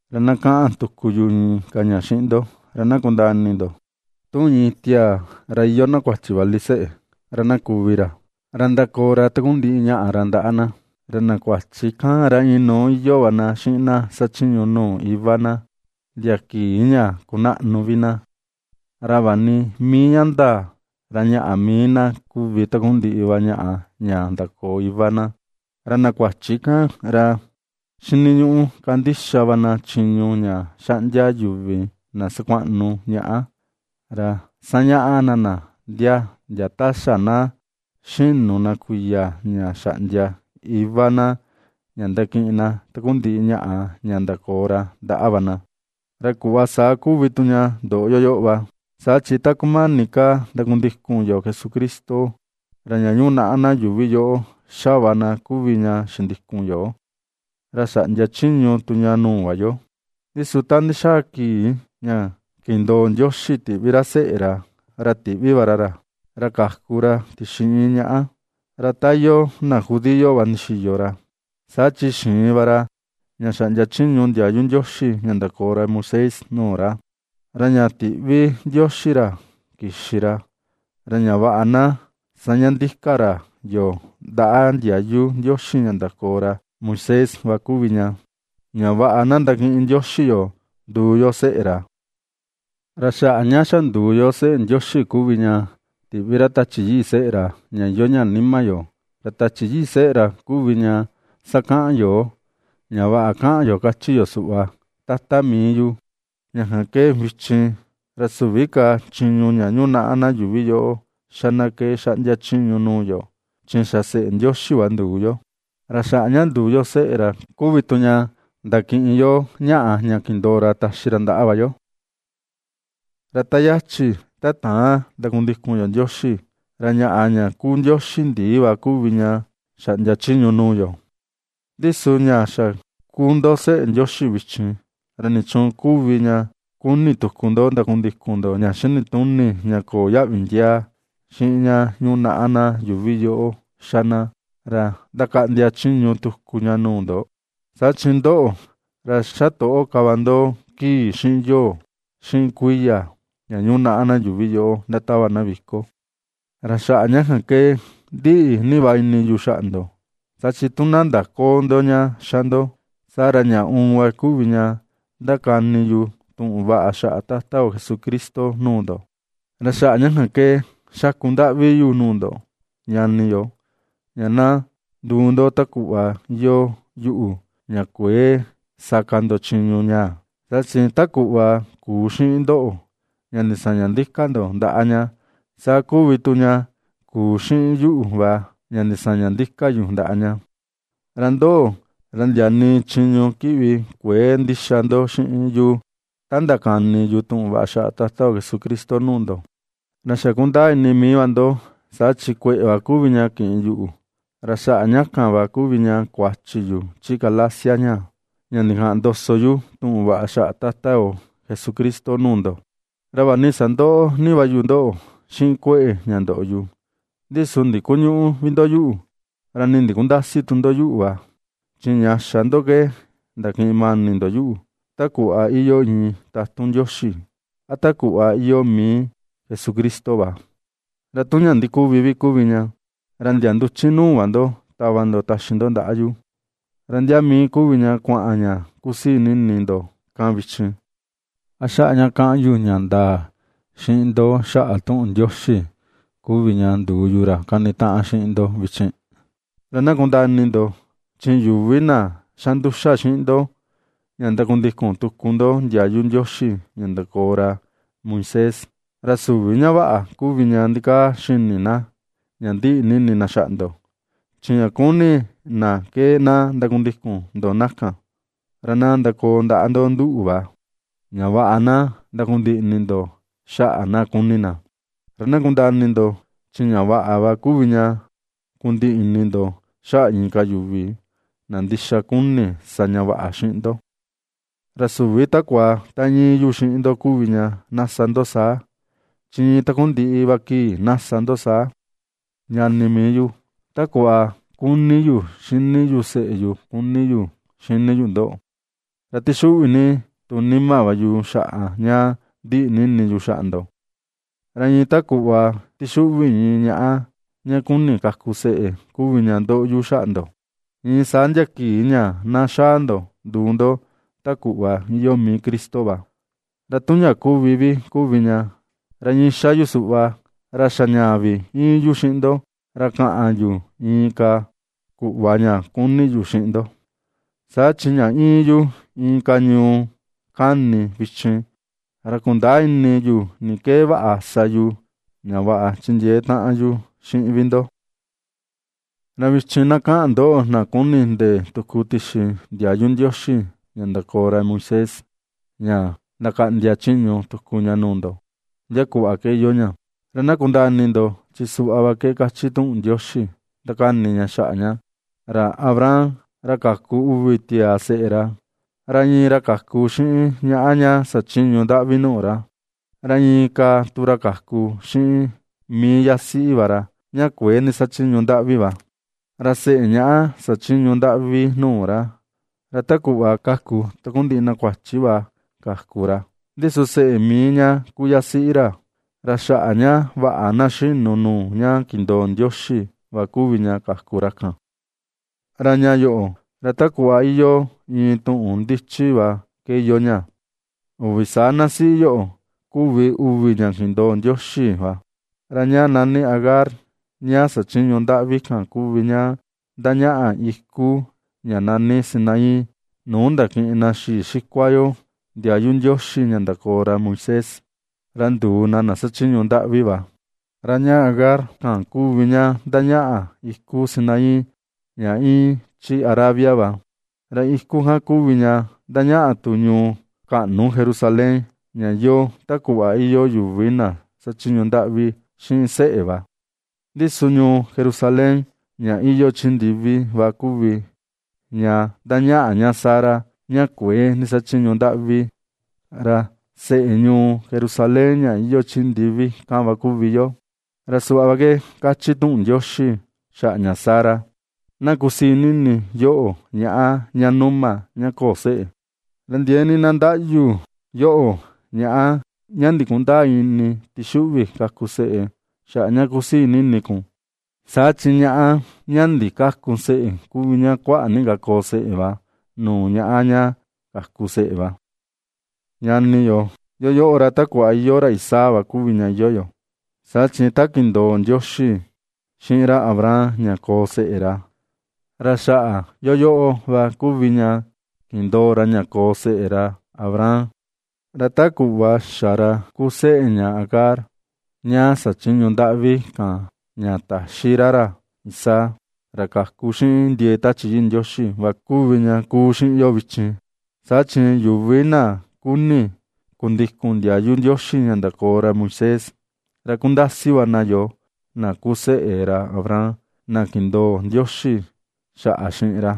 Ra na kaꞌan tuku yu inka ña xiꞌin ndo, ra na kundaa ini ndo: Tu iin tiaa, ra iyoo na kuachi vali seꞌe, ra na kuvi ra, ra ndakoo ra takundiꞌi ñaꞌa ra ndaꞌa na, ra na kuachi kan ra inuu iyoo va na xiꞌin na xachiñu nuu iva na, ndia kii ña kunaꞌnu vi na, ra vaꞌa ni mii ña ndaa ra ñaꞌa mii na kuvi takundiꞌi va ñaꞌa ña ndakoo iva na. Ra na kuachi kan, ra xiniñuꞌu kandixa va na chiñu ña xaꞌndia yuvi na sakuaꞌnu ñaꞌa, ra sañaꞌa na na ndia ta xa na xinu na kuiya ña xaꞌndia iva na ña ndakiꞌin na takundiꞌi ñaꞌa ña ndakoo ra ndaꞌa va na. Ra kuꞌva saa kuvi tu ña ndoꞌo yoo va. Saa chi ta kumani ka ndakundikun yo Jesucristo, ra ña yunaꞌa na yuuvi yoꞌo ^xa va na kuvi ña xindikun yo, ra xaꞌndia chiñu tu ña nuu va yo. Ndi su ta ndixaa kii ña kindoo Ndioxi tiꞌvi ra seꞌe ra, ra tiꞌvi va ra ra, ra kaku ra tixi iin ñaꞌa, ra ta iyoo na judío va ndixiyo ra, saa chi xiin va ra ña xaꞌndia chiñu ndiayu Ndioxi ña ndakoo ra Moisés nuu ra. Ra ña tiꞌvi Ndioxi ra kixi ra, ra ña vaꞌa na ^saña ndika ra yoo ndaꞌa ndiayu Ndioxi ña ndakoo ra Moisés va kuvi ña, ña vaꞌa na ndakiꞌin Ndioxi yoo nduu yo seꞌe ra. Ra xaꞌa ña xa nduu yo seꞌe Ndioxi kuvi ña tiꞌvi ra Tachi Yii seꞌe ra, ña iyoo ña nima yo; ra Tachi Yii seꞌe ra kuvi ña sakaꞌan yoo, ña vaꞌa kaꞌan yo, kachi yo suꞌva: “¡Tata mii yu!” Ña kan ke vichin, ra süvi ka chiñu ña yunaꞌa na yuuvi yoꞌo xa na ke xaꞌndia chiñu nuu yo, chi xa seꞌe Ndioxi va nduu yo, ra xaꞌa ña nduu yo seꞌe ra kuvi tu ña ndakiꞌin yo ñaꞌa ña kindoo ra taxi ra ndaꞌa va yo. Ra ta yachi ta täan ndakundikun yo Ndioxi, ra ñaꞌa ña kuu ndioxi ndii va kuvi ña xaꞌndia chiñu nuu yo. Ndi su ña xa kuu ndo seꞌe Ndioxi vichin, ¿ra nichuun kuvi ña kuni tuku ndo ndakundikun ndo ña xinituni ña köo yaꞌvi ndiaa, xiꞌin ña yunaꞌa na yuuvi yoꞌo xa na, ra ndakaꞌndia chiñu tuku ña nuu ndo? Saa chi ndoꞌo, ra xatoꞌo ka va ndo kii, xiꞌin yoo, xiꞌin kuiya ña yunaꞌa na yuuvi yoꞌo ndatava na viko. Ra xaꞌa ña kan ke ndiꞌi ni va ini yu xaꞌa ndo, saa chi tu na ndaköo ndo ña ^xa ndo, saa ra ña uun va kuvi ña ndakani yu tuꞌun vaꞌa xaꞌa Tata yo Jesucristo nuu ndo. Ra xaꞌa ña kan ke xaku ndaꞌvi yu nuu ndo, ñani yo, ña na nduu ndo ta kuꞌva iyoo yuꞌu, ña kuëe sa ka ndo chiñu ñaa, saa chi ta kuꞌva kuu xiꞌin ndoꞌo ña ndisaña ndika ndo ndaꞌa ña, saa kuvi tu ña kuu xiꞌin yuꞌu va ña ndisaña ndika yu ndaꞌa ña. Ra ndoꞌo, ra ndia nii chiñu kiꞌvi kuëe ndixa ndo xiꞌin yu ta ndakani yu tuꞌun vaꞌa xaꞌa Jesucristo nuu ndo. Ra xa kundaa ini mii va ndo, saa chi kueꞌe va kuvi ña kiꞌin yuꞌu, ra xaꞌa ña kan va kuvi ña kuachi yu chi Galacia ñaa, ña ndikaꞌan ndoso yu tuꞌun vaꞌa xaꞌa Tata yo Jesucristo nuu ndo. Ra vaꞌa ni sandoꞌo ni va yu ndoꞌo xiꞌin kueꞌe ña ndoꞌo yu, ndi su ndikuñüꞌu vi ndo yuꞌu, ra nii ndikundäsi tu ndo yuꞌu va. Chi ña xa ndo ke ndakiꞌin mani ndo yuꞌu, ta kuꞌva iyoo iin tatun Ndioxi a ta kuꞌva iyoo mii Jesucristo va. Ra tu ña ndikuvi kuvi ña, ra ndia nduchi nuu va ndo tava ndo taxi ndo ndaꞌa yu. ¿Ra ndia mii kuvi ña kuaꞌan ña kusii ni ini ndo kan vichin? ¿A xaꞌa ña ^kaꞌan yu ña ndaa xiꞌin ndo xaꞌa tuꞌun Ndioxi kuvi ña nduu yu, ra kanitaꞌan xiꞌin ndo vichin? Ra na kundaa ini ndo, chi yuvi na ^xa nduxa xiꞌin ndo ña ndakundikun tuku ndo ndiayu Ndioxi ña ndakoo ra Moisés, ra süvi ña vaꞌa kuvi ña ndikaa xini na ña ndiꞌi ni ini na xaꞌa ndo, chi ña kuni na ke na ndakundikun ndo na kan, ra na ndakoo ndaꞌa ndo nduꞌu va, ña vaꞌa na ndakundiꞌi ini ndo xaꞌa na kuni na. Ra na kundaa ini ndo, chi ña vaꞌa va kuvi ña kundiꞌi ini ndo xaꞌa inka yuvi, na ndixa kuni sa ña vaꞌa xiꞌin ndo. Ra süvi takua ta íin yu xiꞌin ndo kuvi ña na sa ndo saa, chi iin takundiꞌi va kii na sa ndo saa. Ñani mii yu, ta kuꞌva kuni yu xini yu seꞌe yu kuni yu xini yu ndoꞌo, ra tixuꞌvi ni tu nima va yu xaꞌa ña ndiꞌi ni ini yu xaꞌa ndo. Ra iin ta kuꞌva tixuꞌvi iin ñaꞌa ña ^kuni kaku seꞌe kuvi ña ndoꞌo yu xaꞌa ndo, iin saa ndia kii ña na xaa ndo nduu ndo ta kuꞌva iyoo mii Cristo va. Ra tu ña kuvi vi kuvi ña, ra iin ^xa yu suꞌva, ra xa ñaa vi íin yu xiꞌin ndo, ra kaꞌan yu inka kuꞌva ña kuni yu xiꞌin ndo; saa chi ña íin yu inka ñuu kani vichin, ra kundäa ini yu ni ke vaꞌa sa yu ña vaꞌa chindiee taꞌan yu xiꞌin vi ndo. Ra vichin na kaꞌan ndoꞌo, na ^kuni ^ndee tuku tixi ndiayu Ndioxi ña ndakoo ra Moisés ña ndakaꞌndia chiñu tuku ña nuu ndo, ¿ndia kuꞌva ke iyoo ña? Ra na kundaa ini ndo, chi suꞌva va ke kachi tuꞌun Ndioxi ndakani ña xaꞌa ña: Ra Abraham ra kaku uvi tiaa seꞌe ra, ra iin ra kaku xiꞌin ñaꞌa ña xachiñu ndaꞌvi nuu ra, ra inka tu ra kaku xiꞌin mii yasiꞌi ra ña kuëe ndixachiñu ndaꞌvi va. Ra seꞌe ña xachiñu ndaꞌvi nuu ra, ra ta kuꞌva ^kaku takundiꞌi na kuachi va kaku ra, ndi su seꞌe mii ña kuu yasiꞌi ra, ra xaꞌa ña vaꞌa na xinu nuu ña kindoo Ndioxi va kuvi ña kaku ra kan. Ra ña yoꞌo, ra ta kuꞌva iyoo iin tuꞌun ndichi va ke iyoo ña. Uvi saa na siꞌi yoꞌo, kuvi uvi ña kindoo Ndioxi va. Ra ña nani Agar ña xachiñu ndaꞌvi kan kuvi ña ndañaꞌa iku ña nani Sinaí, nuu ndakiꞌin na xii xikua yo ndiayu Ndioxi ña ndakoo ra Moisés, ra nduu na na xachiñu ndaꞌvi va. Ra ña Agar kan kuvi ña ndañaꞌa iku Sinaí ña íin chi Arabia va, ra iku kan kuvi ña ndañaꞌa tu ñuu kaꞌnu Jerusalén ña iyoo ta kuꞌva iyoo yuvi na xachiñu ndaꞌvi xiꞌin seꞌe va. Ndi su ñuu Jerusalén ña iyoo chi ndivi va kuvi ña ndañaꞌa ña Sara ña kuëe ndixachiñu ndaꞌvi; ra seꞌe ñuu Jerusalén ña iyoo chi ndivi kan va kuvi yoo. Ra suꞌva ke kachi tuꞌun Ndioxi xaꞌa ña Sara: Na kusii ni ini yoꞌo ñaꞌa ña numa, ña köo seꞌe; ra ndiee ni na ndaꞌyu yoꞌo ñaꞌa ña ndikundäa ini tixuꞌvi kaku seꞌe xaꞌa ña kusii ni ini kun. Saa chi ñaꞌa ña ndikäku seꞌe kuvi ña kuaꞌa ni ka koo seꞌe va nuu ñaꞌa ña kaku seꞌe va. Ñani yo, yoo, ra ta kuꞌva iyoo ra Isaac va kuvi ña iyoo yo; saa chi ta kindoo Ndioxi xiꞌin ra Abraham ña koo seꞌe ra, ra xaꞌa yoo va kuvi ña kindoo ra ña koo yo seꞌe ra Abraham. Ra ta kuꞌva xa ra kuu seꞌe ña Agar ña xachiñu ndaꞌvi kan ña ta̱xí ra ra Isaac, ra kaku xiꞌin ndiee Tachi Yii Ndioxi va kuvi ña kuu xiꞌin yo vichin. Saa chi yuvi na kuni kundikun ndiayu Ndioxi ña ndakoo ra Moisés, ra kundasi va na yoo na kuu yo seꞌe ra Abraham na kindoo Ndioxi xaꞌa xiꞌin ra.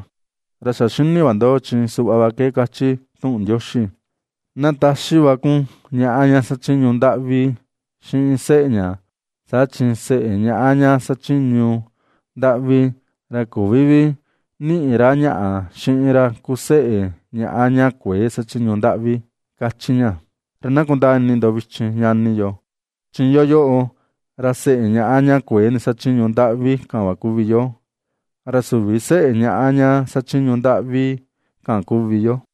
Ra xa xini va ndo, chi suꞌva va ke kachi tuꞌun Ndioxi: “Na taxi va kun ñaꞌa ña xachiñu ndaꞌvi xiꞌin seꞌe ña, saa chi seꞌe ñaꞌa ña xachiñu ndaꞌvi, ra küvi vi niꞌi ra ñaꞌa xiꞌin ra kuu seꞌe ñaꞌa ña kuëe xachiñu ndaꞌvi”, ^kachi ña. Ra na kundaa ini ndo vichin ñani yo, chi yoo, ra seꞌe ñaꞌa ña kuëe ndixachiñu ndaꞌvi kan va kuvi yo, ra süvi vi seꞌe ñaꞌa ña xachiñu ndaꞌvi kan kuvi yo.